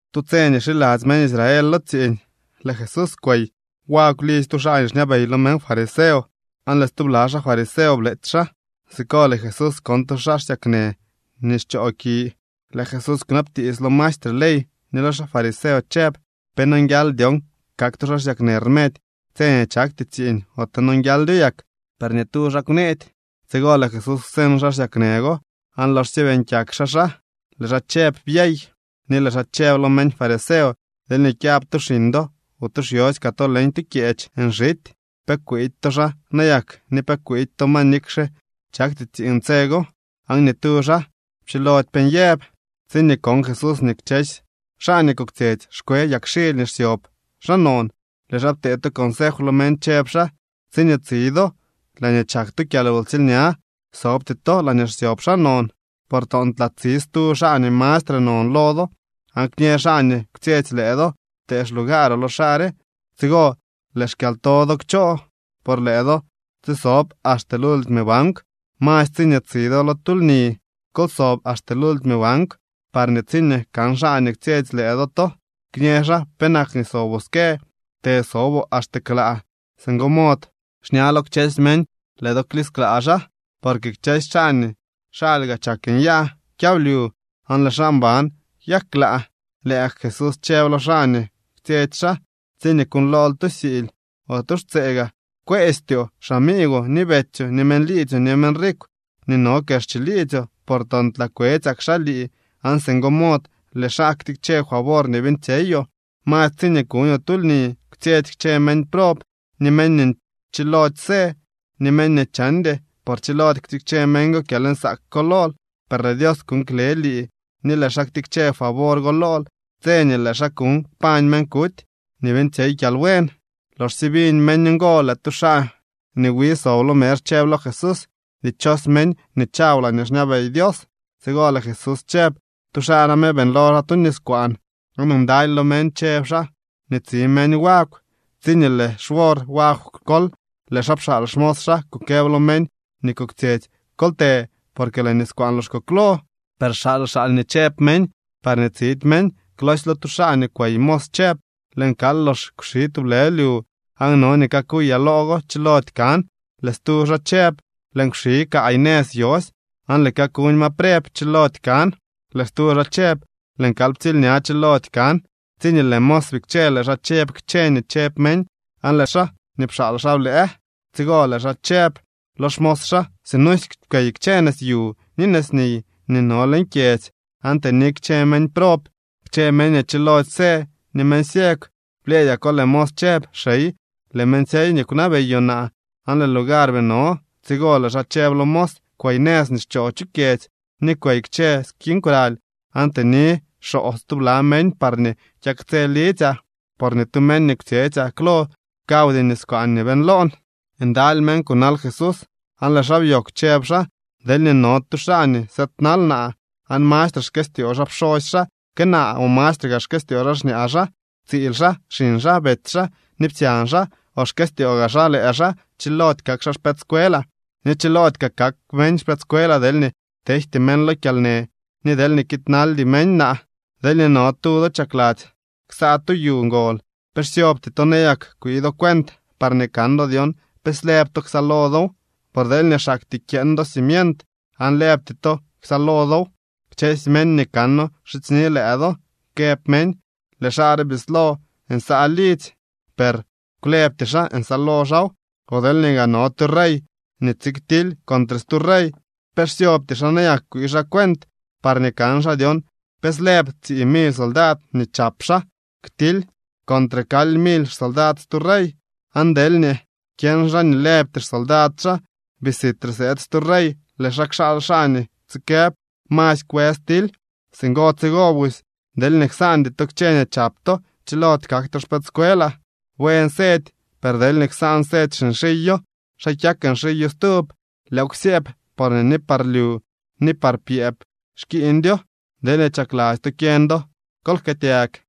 Tu tse nii xiladzy meñ Israel lo tsiiñ lëë Jesús kwey wagw lidzy tu xaa nii xñabey lo meñ fariseo, aan lëë stubla xaa fariseo bleetsy xaa. Siko lëë Jesús kon tu xaa xsyaknë nii xchooki. Lëë Jesús kwnabtiits lo maestre ley ni lo xaa fariseo chëb: —¿Pe nonguial dyon kak tu xaa xsyaknë rmedy tse nii chakty tsiiñ ote nonguialdyo yak? Per ni tu xaa kwneedy. Tsigo lëë Jesús kwseñ xaa xsyaknë go aan loxsye beeñ kyak xaa xaa, lëë xaa chëb: “Byey.” Ni lëë xaa chëb lo meñ fariseo: —Deelñee kyab tu xiñ do o tu xyosy kaa to leñ tu kyeech nxity, ¿pe kwiidy to xaa nayak ni pe kwiidy to ma nikxe chakty tsiiñ tse go? Aan ni tu xaa pchilody pe nyëb. Tsiñee kon Jesús nii kchësy xaa nii koktsyetsy xkwe yagxily nii xsyob xaa non, lëë xaa ptee tu consef lo meñ chëb xaa: —Tsiñee tsi do laañee chak tu kyalwtsiilña, sobty to laañee xsyob xaa non, por toontlaa tsi stu xaa nii mastre non lo do. Aan kñë xaa nii kwtsyetsy lëë do: “Pte xlugaaroo lo xaa re.” Tsigo lëë xkyalto do kchoo por lëë do tsisob axte lultime bankw. Masy tsiñee tsi do lo tu lni, kol sob axte lultime bankw parñee tsiñee kan xaa nii kwtsyetsy lëë do to, kñë xaa: “Penak nii soboo ske. Tësoboo axte klaa.” Singo mod xña lo kchësy meñ lëë do klisklaa xaa. Porque kchësy xaa nii xalyga chak nyaa kyablyu aan lëë xaa mban kyak klaa. Lëë gak Jesús chëb lo xaa nii kwtsyetsy xaa: —Tsiñee kuuñlool tu siily o tu xtsee gaa, kwëstyoo xamiigwoo, ni betsyoo, ni meñ liidzyoo, ni meñ rikw nii no kex chiliidzyoo, por toontlaa kwetsyak xaa lii aan singo mod lëë xaa ktikche favor nii beeñtsyeyoo. Masy tsiñee kuñoo tu lni, kwtsyetsy kchë meñ prob, ni meñ nii chilody së, ni meñ nii chandy. Por chilody ktikche meñ go kyalnsaak ko lool, per lëë Dios kuuñ kle lii ni lëë xaa ktikche favor go lool tse nii lëë xaa kuuñ kpañ meñ kuty nii beeñtsyey kyalbuen. Loxsye biñ meñ ngo, lëë tu xaa nii wi sob lo mezh chëb lo Jesús: —Dichos meñ nii chaw laañee xñabey Dios. Tsigo lëë Jesús chëb: —Tu xaa name beeñlo xaa tu niskwaan aan ndaly lo meñ chëb xaa nii tsi meñ wagw. Tsiñee lëë xwor wagw kol, lëë xaa pxaal xmos xaa kukëb lo meñ nii koktsyetsy: “Kol të por lëë niskwaan lox koklo.” Per xaal xaal nii chëb meñ parñee tsidy meñ. Klosy lo tu xaa nii kwey mos chëb: “Lëën kal lox kwxi tublë lyu, aan no nii kakuyaa loo go. Chilody kan.” Lëë stu xaa chëb: “Lëën kwxi kaay nëz yosy aan lëën kakuñ ma preb. Chilody kan.” Lëë stu xaa chëb: “Lëën kal ptsiilña. Chilody kan.” Tsiñee lëë mos bikche, lëë xaa chëb kchë nii chëb meñ, aan lëë xaa nii pxaal xaa blëë. Tsigo lëë xaa chëb lo xmos xaa: “Sinusy kwey kchë nëz yu ni nëzniy nii no leñ kyedzy, aan tëni kchë meñ prob, kchë meñ nii chilody së, ni meñ ciegw.” Blyëëdyako, lëë mos chëb: “Xey, lëën beeñtsyey nii kwnabeyoo naa, aan lëë lugar bii no.” Tsigo lëë xaa chëb lo mos: “Kwey nëz nii xchoo chu kyedzy ni kwey kchë skiñ kwraly, aan tëni xoo stubla meñ parñee kyaktsë lidzyaa. Por ni tu meñ nii kwtsyetsyaa klo kawdy niskwaan nii beeñloon.” Ndaly meñ kunal Jesús aan lëë xaa byoogw chëb xaa: —Deelñee no tu xaa nii sëëdnal naa aan mastre xkëstyoo xaa pxosy xaa que naa o mastre gaa xkëstyoo xaa xñaa xaa, tsiil xaa, xiñ xaa, betsy xaa ni psyañ xaa, o xkëstyoo gaa xaa lëë xaa, chilody kak xaa xpëëdscuelaa. Ni chiloody kaa kak meñ xpëëdscuelaa deelñee tejty meñ lo kyalnë ni deelñee kiidnaldy meñ naa. Deelñee no tu do chakladzy ksaa tu yu ngol, ¿pe xsyobty to nayak kwii do cuent parñee kan do dyon pe slëb to ksaalo dow? Por deelñee xaktyee kyeeñ do cimient, aan lëbty to ksaalo dow, kchësy meñ nii kano kxidzyni lëë do, këb meñ: “Lëë xaa re bislo nsaa lidzy, per kwlëbty xaa nsaalo xaaw.” O deelñee gaa no tu rey nii tsiktily contre stu rey, ¿pe xsyobty xaa nayak kwii xaa cuent parñee kan xaa dyon pe slëb tsii mily soldad nii chap xaa ktily contre kaly mily xsoldad stu rey? Aan deelñee kyeñ xaa nii lëbty xsoldad xaa, bii sitre sëëd stu rey, lëë xaa kxaal xaa nii tsikëb: “Masy kwës tily.” Singo tsigo busy, deelñee ksaandy to kchë nii chap to, chilody kak to xpëëdscuelaa. ’Buen sedy. Per deelñee ksaan sedy xinxiyo, ¿xa kyak nxiyo stub? Lëëw ksyëëb porñee ni par lyu ni par pyëëb xkiiñdyo. Deelñee chakladzy to kyeñ do, kol jkëëtyag.